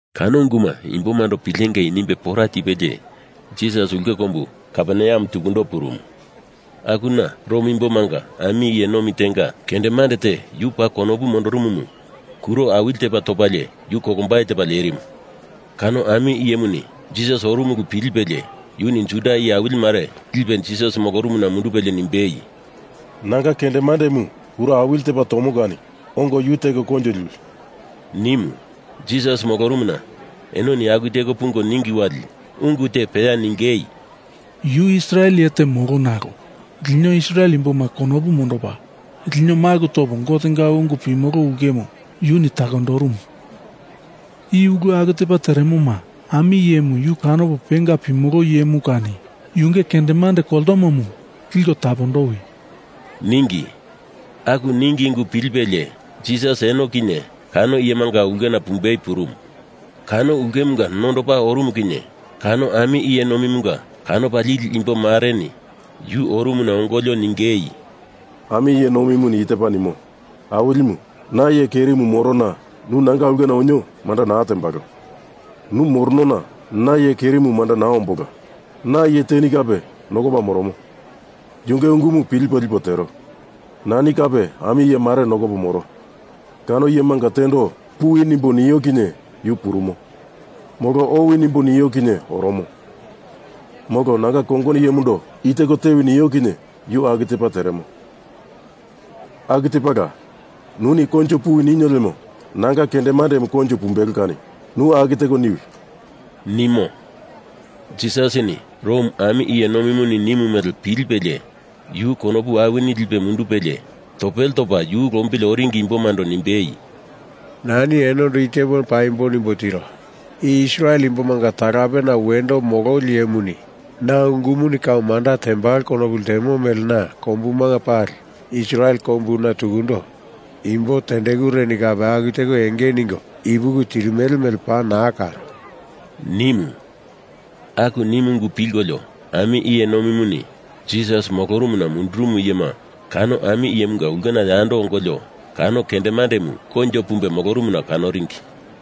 Kano unguma imbomando pilengei nimbe pora tipelie Jisas ulke kombu Kaperneam tukundo purumu. Akuna Rom Imbomanga ami iye nomi tenga kendemande te yu paa konopu mondorumumu kuro awili tepa topalie yu kolombai tepa lerimu. Kano ami iyemuni Jisas orumu ulu pilipelie yuni Juda iye awili mare lipe Jisas molorumuna mundupelie nimbei, “Nanga kendemandemu kuro awili tepa tomo kani ongo yu teko koinjo liwi,” nimu. Jisas molorumuna enoni aku teko pungo ningi wali ungu te peya ningei, “Yu Israel iye te molo, nalo lino Israel imboma konopu mondopa, lino maku topo Gotenga ungu pimolo ulkemu yuni takondorumu. I ulu aku tepa teremoma ami iyemu yu kanopo penga pimolo iyemu kani yunge kendemande koltomomu liko tapondowi,” ningi. Aku ningi ungu pilipelie Jisas eno kinye kano iyemunga ulkena pumbei purumu. Kano ulkemunga nondopa orumu kinye kano ami iye nomimunga kanopa lili imbo mareni yu orumuna ongolio ningei, “Ami iye nomimuni i tepa nimo. Awilimu, na iye kerimu morona nu nanga ulkena onio manda naa tembalo. Nu moronona na iye kerimu manda naa ombola. Na iye teni kape nokopa moromo, yunge ungu pilipo lipo tero. Nani kape ami iye mare nokopo moro. Kano iyemanga tendo puwi nimbo nio kinye yu purumo. Molo owi nimbo nio kinye oromo. Molo nanga kongono iyemundo i teko tewi nio kinye yu aku tepa teremo. Aku tepala, nuni koinjo puwi ninio lemo nanga kendemandemu koinjo pumbelo kani nu aku teko niwi,” nimo. Jisasini Rom ami iye nomimuni nimu mele pilipelie yu konopu awini lipe mundupelie topele topa yu lombili oringi imbomando nimbei, “Nani enondo i tepo paimbo nimbo tiro. I Israel imbomanga talapena wendo mololi iyemuni na ungumuni kau manda tembalo konopu ltemo mele na kombuma pali, Israel kombuna tukundo, imbo tendekureni kape aku teko enge ningo ipuki tirimele mele paa naa karo,” nimu. Aku nimu ungu pilkolio ami iye nomimuni Jisas molorumuna mundurumu iyema kano ami iyemunga ulkena yando ongolio kano kendemandemu koinjo pumbe molorumuna kanoringi.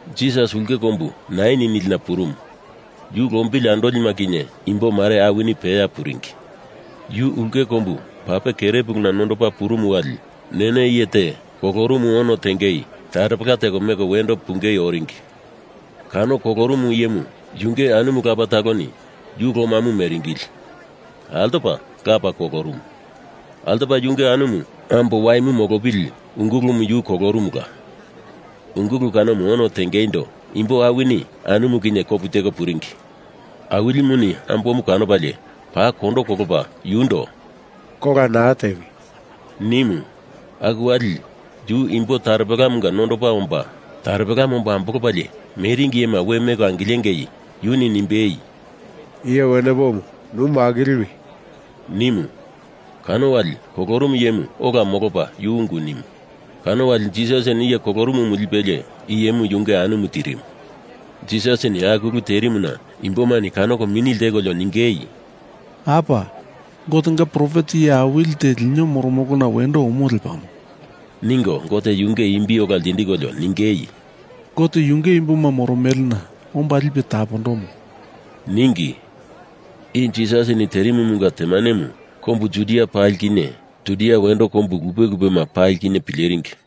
Jisas ulke kombu Nain nilina purumu, yu lombili andolima kinye imbo mare awini peya puringi. Yu ulke kombu pape kerepuluna nondopa purumu wali Nene iye te kolorumu ono tenge taropela teko meko wendo pungei oringi. Kano kolorumu iyemu yunge anumu lapa taloni yu lomamu meringili altopa lapa kolorumu. Altopa yunge anumu ambo waimu molopili ungulumu yu kolorumula. Ungulu kanomu ono tengeindo imbo awini anumu kinye kopu teko puringi. Awilimuni ambomu kanopalie paa kondo kolopa yundo “Kola naa tewi,” nimu. Aku wali yu imbo taropelamunga nondopa omba taropelamu omba ambolopalie meringi iyema we meko angilengei yuni nimbei, “Iye wenepomu nu makiliwi!” nimu. Kano wali kolorumu iyemu ola molopa yu ungu nimu. Kano wali Jisasini iye kolorumumu lipelie iyemu yunge anumu tirimu. Jisasini aku ulu terimuna imbomani kanoko mini ltekolio ningei, “Apa! Gotenga profet iye awili te lino moromolona wendo omo lepamo,” ningo Gote yunge imbi ola ltindikolio ningei, “Gote yunge imboma moromelena omba lipe tapondomo,” ningi. I Jisasini terimumunga temanemu kombu Judia pali kinye Judia wendo kombu lupe lupema pali kinye pileringi.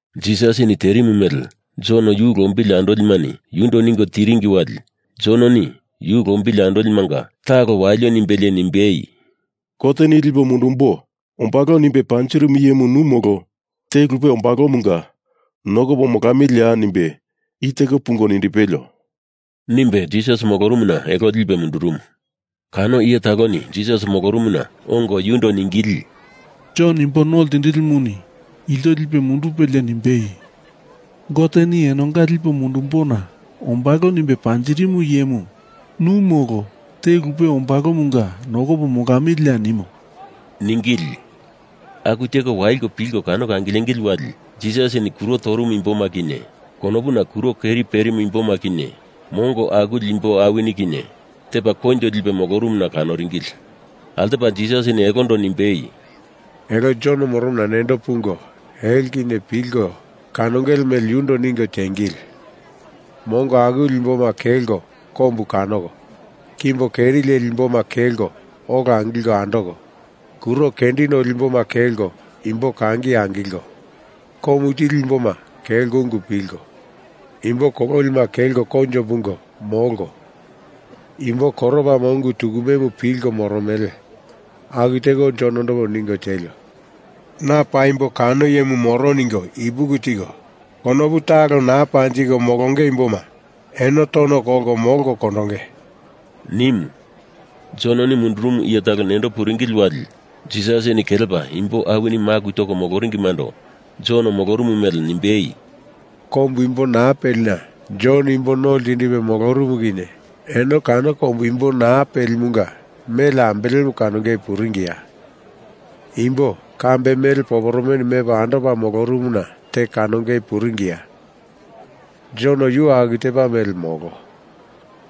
Jisasini terimu mele Jon yu lombili andolimani yundo ningo tiringi wali Jononi yu lombili andolimanga talo walio nimbelie nimbei, “Goteni lipo mundumbo ombalo nimbe panjirimu iyemu nu, molo te lupe ombalomunga nokopo molamiliya nimbe i teko pungo nindipelio,” nimbe Jisas molorumuna elo lipe mundurumu. Kano iye taloni Jisas molorumuna ongo yundo ningili, “Jon Imbo No Ltindilimuni ilto lipe mundupelie nimbei, Goteni Enonga lipo mundumbona ombalo nimbe panjirimu iyemu nu molo te lupe ombalomunga nokopo molamiliya nimo,” ningili. Aku teko waliko pilko kanoko angilengili wali Jisasini kuro torumu imboma kinye, konopuna kuro keri perimu imboma kinye, mongo akuli imbo awini kinye, tepa koinjo lipe molorumuna kanoringili. Altopa Jisasini elondo nimbei, “Elo Jon moromona nendo pungo elo kinye pilko kanongele mele yundo ningo tiengili! Mongo akuli imboma kelko kombu kanoko, kimbo keri leli imboma kelko ola angilko andoko, kuro kendi noli imboma kelko imbo kangi angilko, komu tili imboma kelko ungu pilko, imbo kololima kelko koinjo pungo molko, imbo koropama ungu tukumemu pilko moromele. Aku teko Jonondo ningo tielio! Na paimbo kano iyemu moro ningo ipuki tiko, konopu talo naa panjiko molonge imboma eno tono kolko molko kondonge,” nimu. Jononi mundurumu iye talo nendo puringili wali Jisasini kelepa imbo awini maku toko moloringimando Jon molorumu mele nimbei, “Kombu imbo naa pelina Jon imbo no ltindipe molorumu kinye eno kano kombu imbo naa pelimunga mele ambelemu kanongei puringiya? Imbo, kambe mele poporomeni mepa andopa molorumuna te kanongei puringiya? Jon yu aku tepa mele molo.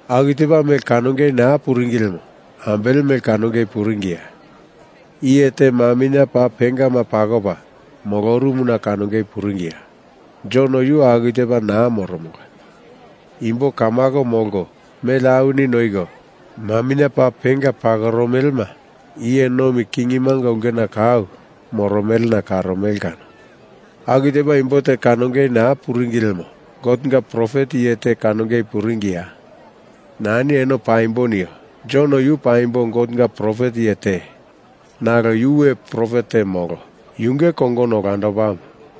Aku tepa mele kanongei naa puringi lemo ambele mele kanongei puringiya? Iye te maminye paa pengama pakopa molorumuna kanongei puringiya? Jon yu aku tepa naa moromola. Imbo kamako molko, mele awini noiko, maminye paa penga pakoromelema iye nomi kingimanga ulkena kau moromelena karomele kano. Aku tepa imbo te kanongei naa puringi lemo Gotenga profet iye te kanongei puringiya? Nani eno paimbo nio. Jon yu paimbo Gotenga profet iye te, nalo yu we profet te molo. Yunge kongono olandopamu.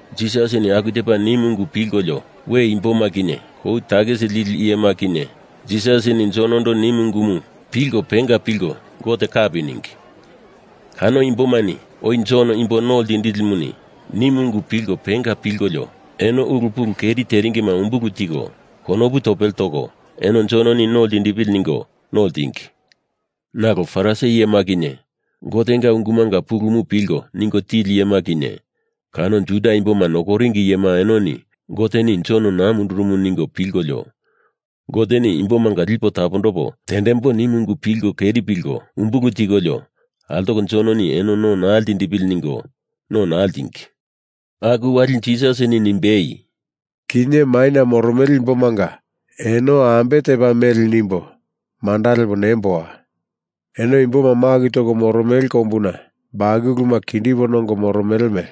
Jisasini aku tepa nimu ungu pilkolio we imboma kinye kou takisi lili iyema kinye Jisasini Jonondo nimu ungumu pilko penga pilko Gote kapi ningi. Kano imbomani oi Jon Imbo No Ltindilimuni nimu ungumu pilko penga pilkolio eno ulu pulu keri teringima umbulu tiko, konopu topele toko eno Jononi no ltindipili ningo no ltingi. Nalo Farisi iyema kinye, Gotenga ungumanga pulumu pilko ningo tili iyema kinye, kano Juda Imboma nokoringi iyema enoni Goteni Jon naa mundurumu ningo pilkolio, Goteni imbomanga lipo tapondopo tendembo nimu ungumu pilko keri pilko umbulu tikolio altoko Jononi eno no naa ltindipili ningo no naa ltingi. Aku wali Jisasini nimbei, “Kinye maina moromele imbomanga eno ambe tepa mele nimbo manda lepo nemboa. Eno imboma maku toko moromele kombuna bakuluma kindipo nongo moromele mele.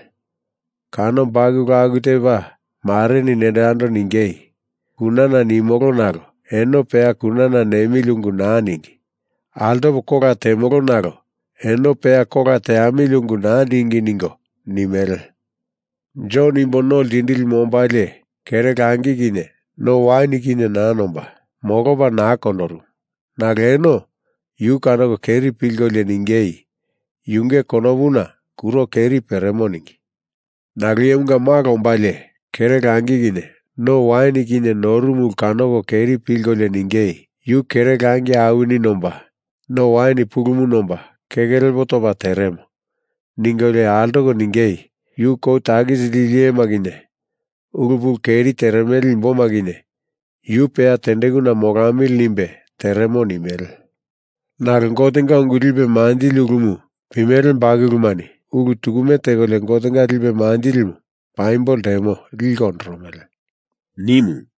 Kano bakulu aku tepa mareni nendo yando ningei, ‘Kunana nimolo nalo eno peya kunana nemili ungu naa ningi. Altopo kola temolo nalo eno peya kola teamili ungu naa ningi,’ ningo nimele. Jon Imbo No Ltindilimu ombalie kere langi kinye no wain kinye naa nomba, molopa naa kondorumu, nalo eno yu kanoko keri pilkolio ningei, yunge konopuna kuro keri peremo ningi. Nalo Iyemunga Malo ombalie kere langi kinye no wain kinye norumu ulu kanoko keri pilkolio ningei, ‘Yu kere langi awini nomba, no wain pulumu nomba, keke lepo topa teremo,’ ningolio altoko ningei, ‘Yu kou takisi lili iyema kinye, ulu pulu keri teremele imboma kinye yu peya tendekuna molamili nimbe teremo,’ nimele. Nalo Gotenga ungu lipe manjili ulumu pimele bakulumani ulu tukume tekolio Gotenga lipe manjilimu paimbo ltemo liko ondoromele,” nimu.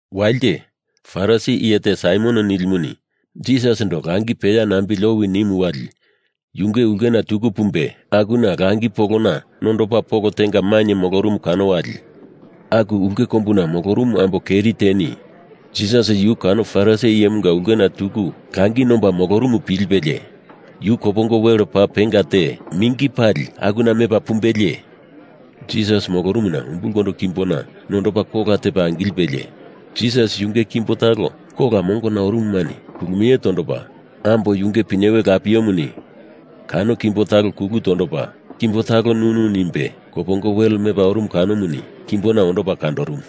Walite, Farisi iye te Saimon nilimuni Jisasindo langi peya nambili owi nimu wali yunge ulkena tuku pumbe akuna langi polona nondopa polo tenga mainye molorumu kano wali aku ulke kombuna molorumu ambo keri teni Jisas yu kano Farisi iyemunga ulkena tuku langi nomba molorumu pilipelie, yu kopongo wele paa penga te mingi pali lipe akuna mepa pumbelie, Jisas molorumuna umbulkondo kimbona nondopa kola tepa angilipelie, Jisas yunge kimbo talo kola mongona orumumani kulumie tondopa, ambo yunge pinyewe lapiemuni kano kimbo talo kulu tondopa, kimbo talo nunu nimbe, kopongo wel mepa orumu kanomuni kimbona ondopa kandorumu.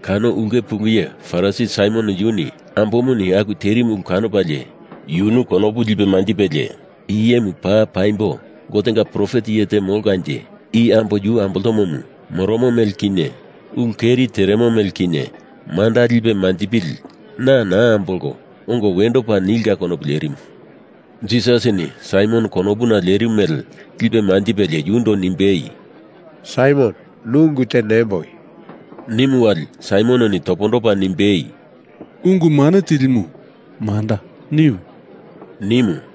Kano ulke pulu iye Farisi Saimon yuni ambomuni aku terimu ulu kanopalie yunu konopu lipe manjipelie i iyemu paa paimbo Gotenga profet iye te molkanje i ambo yu amboltomomu moromo mele kinye ulu keri teremo mele kinye manda lipe manjipili na naa ambolko, ongo wendo pa nilka konopu lerimu. Jisasini Saimon konopuna lerimu mele lipe manjipelie yundo nimbei, “Saimon, nu ungu te nemboi,” nimu wali Saimononi topondopa nimbei, “Ungu Mane Tilimu, manda, niwi!” nimu.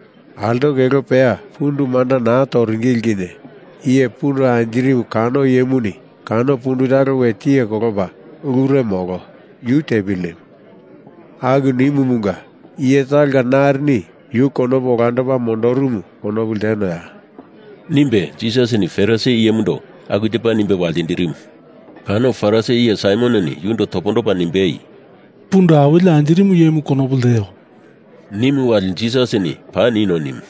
Altoko elo peya pundu manda naa toringili kinye iye pundu anjirimu kano iyemuni kano pundu talo we tiye kolopa ulure molo, yu tepili nimu. Aku nimumunga iye talonga narini yu konopu olandopa mondorumu konopu ltenoya?” nimbe Jisasini Farisi iyemundo aku tepa nimbe waltindirimu. Kano Farisi iye Saimononi yundo topondopa nimbei, “Pundu awili anjirimu iyemu, konopu lteo,” nimu wali Jisasini paa nino nimu.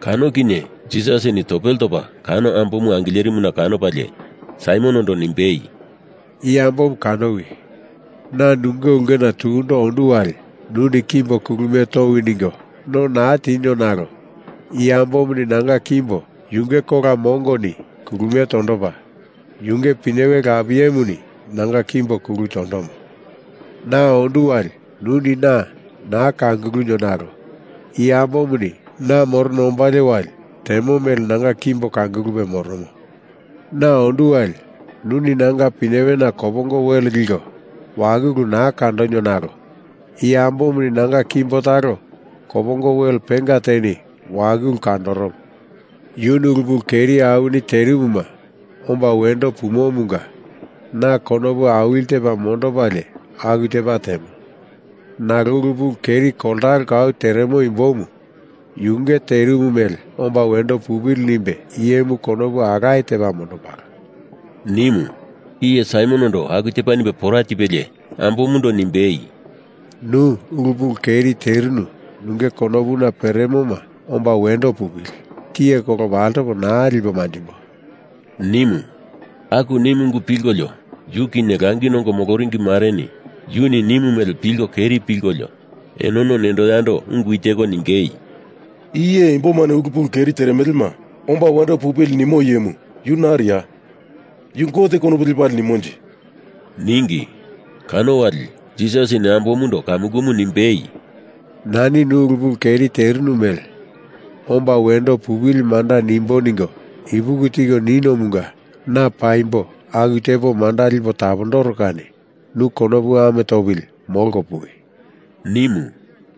Kano kinye Jisasini topele topa kano ambomu angilerimuna kanopalie Saimonondo nimbei, “I ambomu kanowi. Na nunge ulkena tukundo ondu wali nuni kimbo kulumie towi ningo no naa tinio nalo i ambomuni nanga kimbo yunge kola mongoni kulumie tondopa, yunge pinyewe lapiemuni nanga kimbo kulu tondomo. Na ondu wali nuni na naa kangulunio nalo i ambomuni na morona ombalie wali temo mele nanga kimbo kangulupe moromo. Na ondu wali nuni nanga pinyewena kopongo wele liko wakulu naa kandonio nalo i ambomuni nanga kimbo talo kopongo wel penga teni wakulu kandondoromo. Yuni ulu pulu keri awini terimuma omba wendo pumomunga na konopu awili tepa mondopalie aku tepa temo. Nalo ulu pulu keri koltalo kau teremo imbomu yunge terimu mele omba wendo pupili nimbo iyemu konopu alaye tepa mondombalo,” nimu. Iye Saimonondo aku tepa nimbe pora tipelie, ambomundo nimbei, “Nu ulu pulu keri terinu nunge konopuna peremoma omba wendo pupili! Tiye kolopo altopo naa lipo manjimbo,” nimu. Aku nimu ungu pilkolio yu kinye langi nongo moloringi mareni yuni nimu mele pilko keri pilkolio enono nendo yando ungu i teko ningei, “I iye imbomani ulu pulu keri teremelema omba wendo pupili nimo iyemu yu nariya? Yu Gote konopu lepalie nimonje?” ningi. Kano wali, Jisasini ambomundo kamukumu nimbei, “Nani nu ulu pulu keri terinu mele omba wendo pupili manda nimbo ningo ipuki tiko ninomunga na paimbo aku tepo manda lipo tapondoro kani nu konopu ame topili molko puwi,” nimu.